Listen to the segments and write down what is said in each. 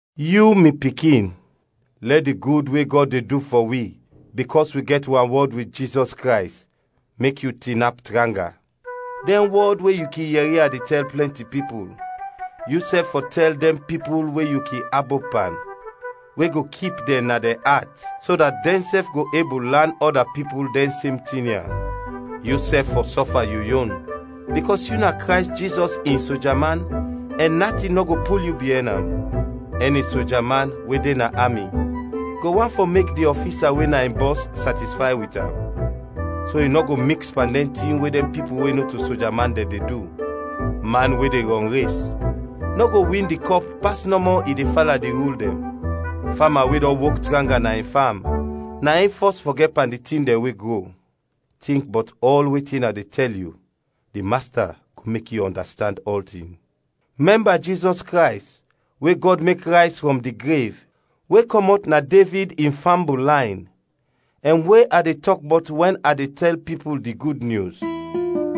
Yu, mi pikin, lɛ di gud we Gɔd de du fɔ wi, bikɔs wi gɛt wanwɔd wit Jizɔs Krays, mek yu tinap tranga. Dɛn wɔd we yu kin yɛri a de tɛl plɛnti pipul, yusɛf fɔ tɛl dɛn pipul we yu kin abop pan, we go kip dɛn na dɛn at, so dat dɛnsɛf go ebul lan ɔda pipul dɛn sem tin ya. Yusɛf fɔ sɔfa yu yon, bikɔs yu na Krays Jizɔs in soja man ɛn natin nɔ go pul yu biɛn am. Ɛni soja man we de na ami go want fɔ mek di ɔfisa we na in bɔs satisfay wit am, so i nɔ go miks pan dɛn tin we dɛn pipul we nɔto soja man dɛn de du. Man we de rɔnres nɔ go win di kɔp pas nɔmɔ i de fala di rul dɛn. Fama we dɔn wok tranga na in fam na in fɔs fɔ gɛt pan di tin dɛn we gro. Tink bɔt ɔl wetin a de tɛl yu, di Masta go mek yu ɔndastand ɔltin. Mɛmba Jizɔs Krays, we Gɔd mek rayz frɔm di grev, we kɔmɔt na Devid in fambul layn, ɛn we a de tɔk bɔt wɛn a de tɛl pipul di Gud Nyus.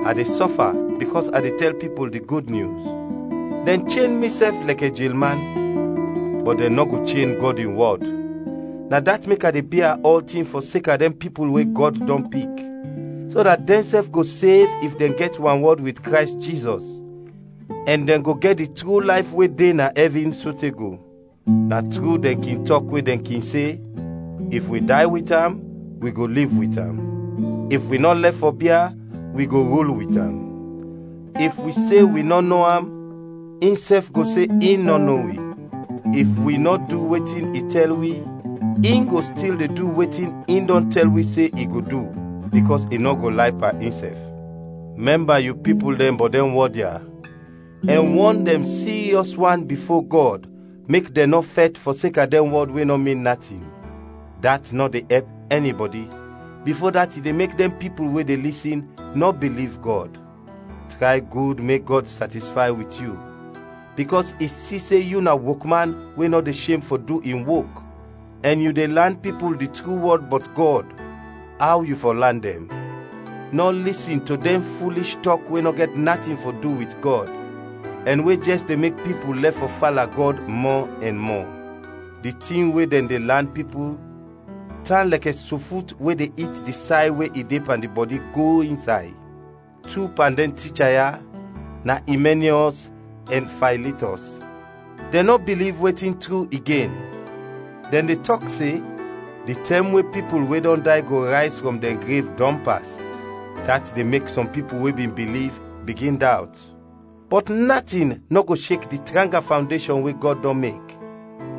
A de sɔfa bikɔs a de tɛl pipul di Gud Nyus, dɛn chen mi sɛf lɛkɛ jelman, bɔt dɛn nɔ go chen Gɔd in wɔd; na dat mek a de bia ɔltin fɔseka dɛn pipul we Gɔd dɔn pik, so dat dɛnsɛf go sev if dɛn gɛt wanwɔd wit Krays Jizɔs ɛn dɛn go gɛt di tru layf we de na ɛvin sote go. Na tru dɛn kin tɔk we dɛn kin se: “If wi day wit am, wi go liv wit am. If wi nɔ lɛf fɔ bia, wi go rul wit am. If wi se wi nɔ no am, insɛf go se in nɔ no wi. If wi nɔ du wetin i tɛl wi, in go stil de du wetin i dɔn tɛl wi se in go du, bikɔs i nɔ go lay pan insɛf.” Mɛmba yu pipul dɛn bɔt dɛn wɔd ya, ɛn wɔn dɛn siryɔs wan bifo Gɔd mek dɛn nɔ fɛt fɔseka dɛn wɔd we nɔ min natin. Dat nɔ de ɛp ɛnibɔdi, bifo dat i de mek dɛn pipul we de lisin, nɔ biliv Gɔd. Tray gud mek Gɔd satisfay wit yu, bikɔs i si se yu na wokman we nɔ de shem fɔ du in wok ɛn yu de lan pipul di tru wɔd bɔt Gɔd, aw yu fɔ lan dɛn. Nɔ lisin to dɛn fulish tɔk we nɔ gɛt natin fɔ du wit Gɔd, ɛn we jɛs de mek pipul lɛf fɔ fala Gɔd mɔ ɛn mɔ. Di tin we dɛn de lan pipul tan lɛkɛ sofut we de it di say we i de pan di bɔdi go insay. Tu pan dɛn ticha ya na Imɛniɔs ɛn Faylitɔs. Dɛn nɔ biliv wetin tru igen, dɛn de tɔk se di tɛm we pipul we dɔn day go rayz frɔm dɛn grev dɔn pas; dat de mek sɔm pipul we bin biliv, bigin dawt. Bɔt natin nɔ go shek di tranga fawndeshɔn we Gɔd dɔn mek;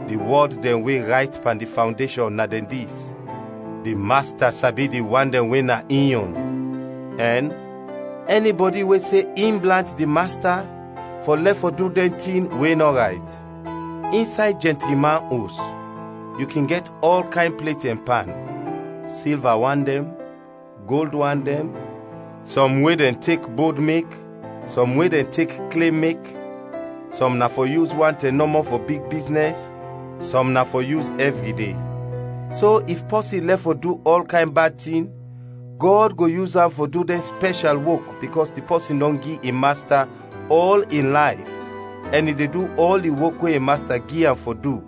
di wɔd dɛn we rayt pan di fawndeshɔn na dɛn dis: “Di Masta sabi di wan dɛn we na in yon” ɛn “Ɛnibɔdi we se in blant di Masta fɔ lɛf fɔ du dɛn tin we nɔ rayt.” Insay jɛntri man os yu kin gɛt ɔl kayn plet ɛn pan: silva wan dɛn, gold wan dɛn, sɔm we dɛn tek bod mek, sɔm we dɛn tek kle mek; sɔm na fɔ yus wan tɛm nɔmɔ fɔ big biznɛs, sɔm na fɔ yus ɛvri de. So if pɔsin lɛf fɔ du ɔl kayn bad tin, Gɔd go yus am fɔ du dɛn spɛshal wok bikɔs di pɔsin dɔn gi in Masta ɔl in layf ɛn i de du ɔl di wok we in Masta gi am fɔ du,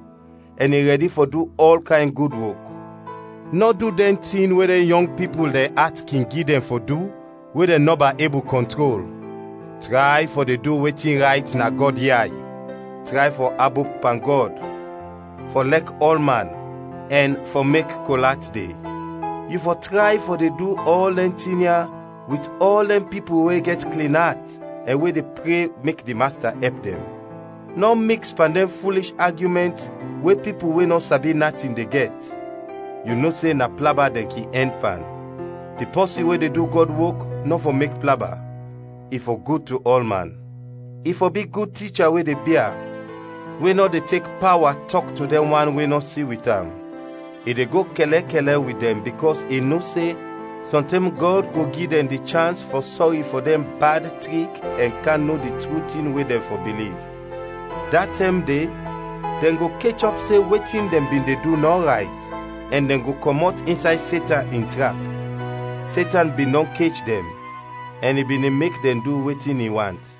ɛn i rɛdi fɔ du ɔl kayn gud wok. Nɔ du dɛn tin we dɛn yɔng pipul dɛn at kin gi dɛn fɔ du we dɛn nɔba ebul kɔntrol; tray fɔ de du wetin rayt na Gɔd yay, tray fɔ abop pan Gɔd, fɔ lɛk ɔlman ɛn fɔ mek kol at de; yu fɔ tray fɔ de du ɔl dɛn tin ya wit ɔl dɛn pipul we gɛt klin at ɛn we de pre mek di Masta ɛp dɛn. Nɔ miks pan dɛn fulish agyumɛnt we pipul we nɔ sabi natin de gɛt; yu no se na plaba dɛn kin ɛnd pan. Di pɔsin we de du Gɔd wok nɔ fɔ mek plaba, i fɔ gud to ɔlman; i fɔ bi gud ticha we de bia, we nɔ de tek pawa tɔk to dɛn wan we nɔ si wit am. I de go kɛlɛkɛlɛ wit dɛn bikɔs i no se sɔntɛm Gɔd go gi dɛn di chans fɔ sɔri fɔ dɛn bad trik ɛn kam no di tru tin we dɛn fɔ biliv. Da tɛm de dɛn go kechɔp se wetin dɛn bin de du nɔ rayt ɛn dɛn go kɔmɔt insay Setan in trap; Setan bin dɔn kech dɛn ɛn i bin de mek dɛn du wetin i want.